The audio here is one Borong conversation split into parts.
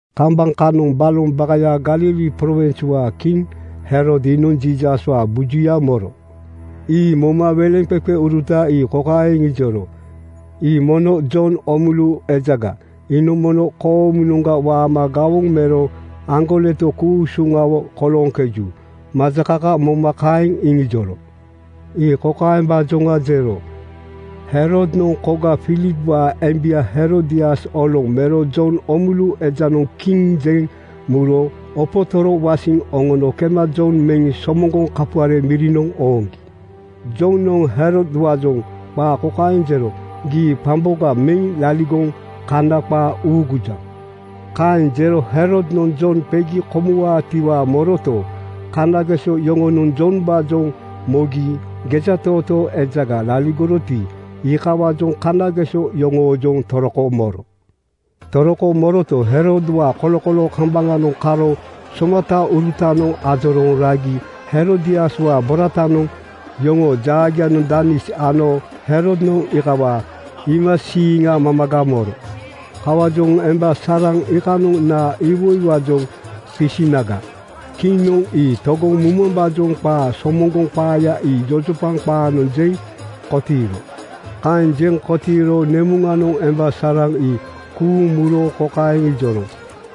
Kambaŋ kanoŋ baloŋ bakayaa (Galili prowinswaa) kiŋ Herod iinoŋ Jiisaswaa bujuya moro. Ii moma weleŋqeqeuruta ii kokaeŋ iŋijoro, “Ii mono Jon Oomulu ejaga. Iinoŋ mono koomunoŋga waama gawoŋ mero aŋgoleto ku-usuŋawo kolooŋkeju.” Majakaka moma kaeŋ iŋijoro. Ii kokaembaajoŋa jero: Herodnoŋ koga Filipwaa embia Herodias oloŋ mero Jon Oomulu ejanoŋ kiŋ jeŋ muro opotoro wasiŋ oŋono kema Jon meŋ somoŋgoŋ kapuare mirinoŋ ooŋgi. Jonoŋ Herodwaajoŋ qaa kokaeŋ jero, “Gii qamboga meŋ laligoŋ Kana qaa uugujaŋ.” Kaeŋ jero Herodnoŋ Jon qegi komuwaatiwaa moroto, kanageso yoŋonoŋ Jombaajoŋ mogi gejatootoo ejaga laligoroti, iikawaajoŋ kanageso yoŋoojoŋ toroko moro. Toroko moroto, Herodwaa kolokoloo kambaŋanoŋ karo somataurutanoŋ ajorooŋ ragi Herodiaswaa boratanoŋ yoŋoo jaagianoŋ danis ano Herodnoŋ iikawaa iimasiiŋa mamaga moro. Kawaajoŋ emba saraŋ iikanoŋ naa iwoiwaajoŋ qisinaga, kiŋnoŋ ii togoŋ mumambaajoŋ qaa somoŋgoŋ qaaya ii jojopaŋ qaanoŋ jeŋ kotiiro. Kaeŋ jeŋ kotiiro nemuŋanoŋ emba saraŋ ii kuuŋ muro kokaeŋ ijoro,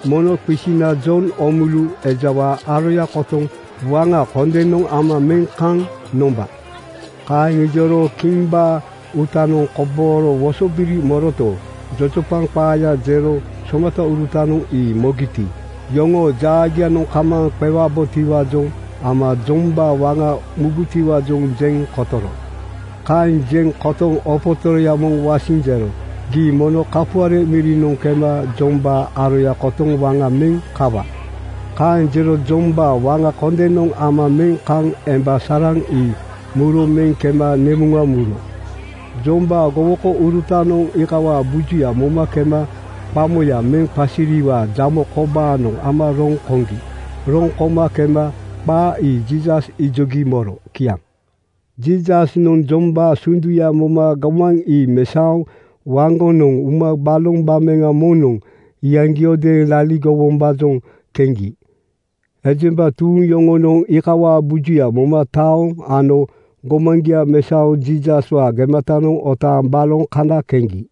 “Mono qisina Jon Oomulu ejawaa aroya kotoŋ waŋa kondenoŋ ama meŋ kaŋ nomba.” Kaeŋ ijoro kimbaa uutanoŋ kobooro wosobiri moroto, jojopaŋ qaaya jero somataurutanoŋ ii mogiti, iyoŋoo jaagianoŋ kamaaŋ qewabotiwaajoŋ ama Jombaa waŋa mubutiwaajoŋ jeŋ kotoro. Kaeŋ jeŋ kotoŋ opotoroya moŋ wasiŋ jero, “Gii mono kapuare mirinoŋ kema Jombaa aroya kotoŋ waŋa meŋ kawa.” Kaeŋ jero Jombaa waŋa kondenoŋ ama meŋ kaŋ emba saraŋ ii muro meŋ kema nemuŋa muro. Jombaa gowokourutanoŋ iikawaa bujuya moma kema qamoya meŋ qasiriwaa jamo kobaanoŋ ama roŋ koŋgi. Roŋ koma kema qaa ii Jiisas ijogi moro. Kiaŋ. Jiisasnoŋ Jombaa sunduya moma gomaŋ ii mesaoŋ waŋgonoŋ uma baloŋ gbameŋa moŋnoŋ iyaŋgiodeeŋ laligowombaajoŋ keŋgi. Ejemba tuuŋ yoŋonoŋ iikawaa bujuya moma taoŋ ano gomaŋgia mesaoŋ Jiisaswaa gematanoŋ otaaŋ baloŋ kana keŋgi.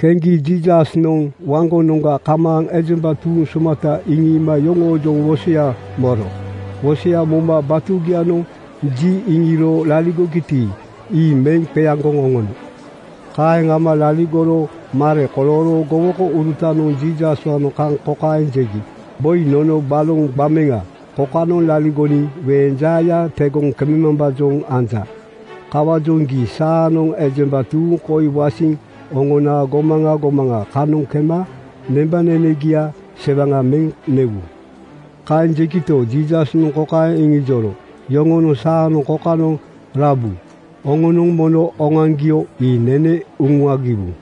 Keŋgi Jiisasnoŋ waŋgonoŋga kamaaŋ ejemba tuuŋ somata iŋiima yoŋoojoŋ wosoya moro. Wosoya moma batugianoŋ ji iŋiro laligogiti, ii meŋ qeaŋgoŋ oŋono. Kaeŋ ama laligoro mare kolooro gowokourutanoŋ Jiisaswaanoŋ kaŋ kokaeŋ jegi, “Boi, nono baloŋ gbameŋa kokanoŋ laligoniŋ weeŋ jaaya tegoŋ kememambaajoŋ anja. Kawaajoŋ gii saanoŋ ejemba tuuŋ koi wasiŋ oŋona gomaŋa gomaŋa kanoŋ kema nembanenegia sewaŋa meŋ newu.” Kaeŋ jegito, Jiisasnoŋ kokaeŋ iŋijoro, “Yoŋonoŋ saanoŋ kokanoŋ rabu. Oŋonoŋ mono oŋoaŋgio ii nene uŋuagiwu.”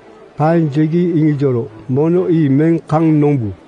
Kaeŋ jegi iŋijoro, “Mono ii meŋ kaŋ nombu.”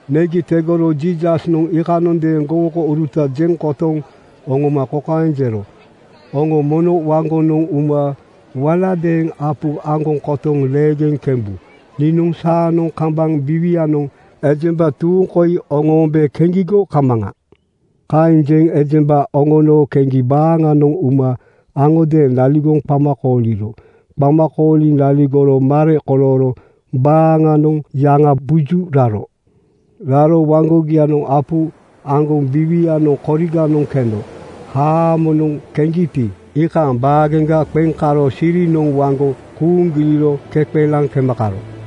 Negi tegoro Jiisasnoŋ iikanondeeŋ gowokouruta jeŋ kotoŋ oŋoma kokaeŋ jero, “Oŋo mono waŋgonoŋ uma waladeeŋ apu aŋgoŋ kotoŋ leegeŋ kembu. Niinoŋ saanoŋ kambaŋ biiwianoŋ ejemba tuuŋ koi oŋoombe keŋgigo kamaŋa.” Kaeŋ jeŋ ejemba oŋoono keŋgi baaŋanoŋ uma aŋodeeŋ laligoŋ qama kooliro. Qama kooliŋ laligoro mare kolooro baaŋanoŋ yaŋabuju raro. Raro waŋgogianoŋ apu aŋgoŋ biiwianoŋ koriganoŋ keno haamonoŋ keŋgiti, iikaaŋ baageŋga qeŋ karo sirinoŋ waŋgo kuuŋ giliro keqelaŋ kema karo.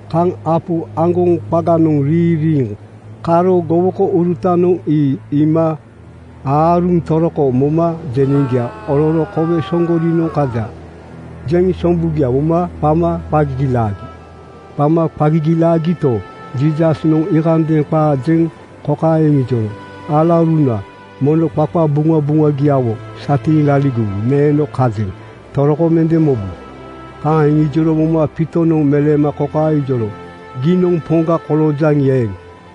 Kaŋ apu aŋgoŋ qaganoŋ riiŋ riiŋ karo gowokourutanoŋ ii iima aaruŋ toroko moma jeneŋgia ororo “Kowe Soŋgorinoŋ kaja,” jeŋ sombugia moma qama qa gigilaagi. Qama qa gigilaagito, Jiisasnoŋ iikanondeeŋ qaa jeŋ kokaeŋ iŋijoro, “Alauruna, mono qaqabuŋabuŋagiawo satiiŋ laligowu. Neeno kajeŋ. Toroko mende mobu.” Kaeŋ iŋijoro moma Piitonoŋ meleema kokaeŋ ijoro, “Giinoŋ Poŋga koloojaŋi eeŋ,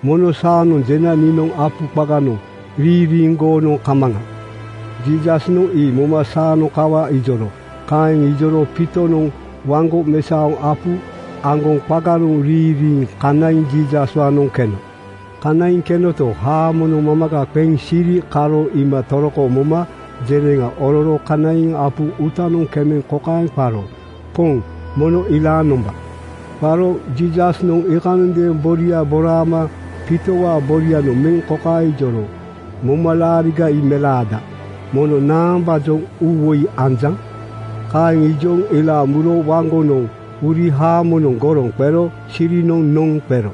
mono saanoŋ jena niinoŋ apu qaganoŋ riiŋ riiŋ goonoŋ kamaŋa.” Jiisasnoŋ ii moma “Saanoŋ kawa,” ijoro. Kaeŋ ijoro Piitonoŋ waŋgo mesaoŋ apu aŋgoŋ qaganoŋ riiŋ riiŋ kanaiŋ Jiisaswaanoŋ keno. Kanaiŋ kenoto, haamonoŋ mamaga qeŋ siri karo iima toroko moma jeneŋa ororo kanaiŋ apu uutanoŋ kemeŋ kokaeŋ qaro, “Poŋ, mono ilaaŋ nomba!” Qaro Jiisasnoŋ iikanondeeŋ boria boraama Piitowaa borianoŋ meŋ kokaeŋ ijoro, “Momalaariga ii melaada. Mono naambaajoŋ uuwoi anjaŋ?” Kaeŋ ijoŋ ilaaŋ muro waŋgonoŋ uri haamonoŋ goroŋ qero sirinoŋ noŋ qero.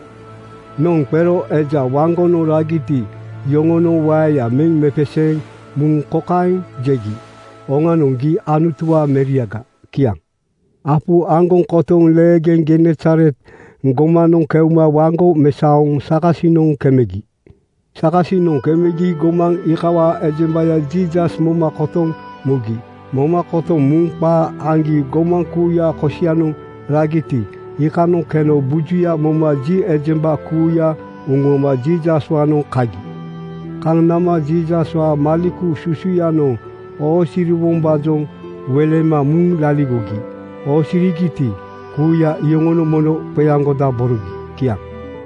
Noŋ qero eja waŋgonoŋ ragiti, iyoŋonoŋ waeya meŋ mepeseeŋ muŋ kokaeŋ jegi, “Oŋanoŋ, gii Anutuwaa meriaga.” Kiaŋ. Apu aŋgoŋ kotoŋ leegeŋ Genesaret gomanoŋ keuma waŋgo mesaoŋ sakasinoŋ kemegi. Sakasinoŋ kemegi gomaŋ iikawaa ejembaya Jiisas moma kotoŋ mugi. Moma kotoŋ muŋ qaa aŋgi gomaŋ kuuya kosianoŋ ragiti, iikanoŋ keno bujuya moma ji ejemba kuuya uŋuama Jiisaswaanoŋ kagi. Kaŋ nama Jiisaswaa maleku susuyanoŋ oosiriwombaajoŋ welema muŋ laligogi. Oosirigiti, kuuya iyoŋonoŋ mono qeaŋgodaborogi. Kiaŋ.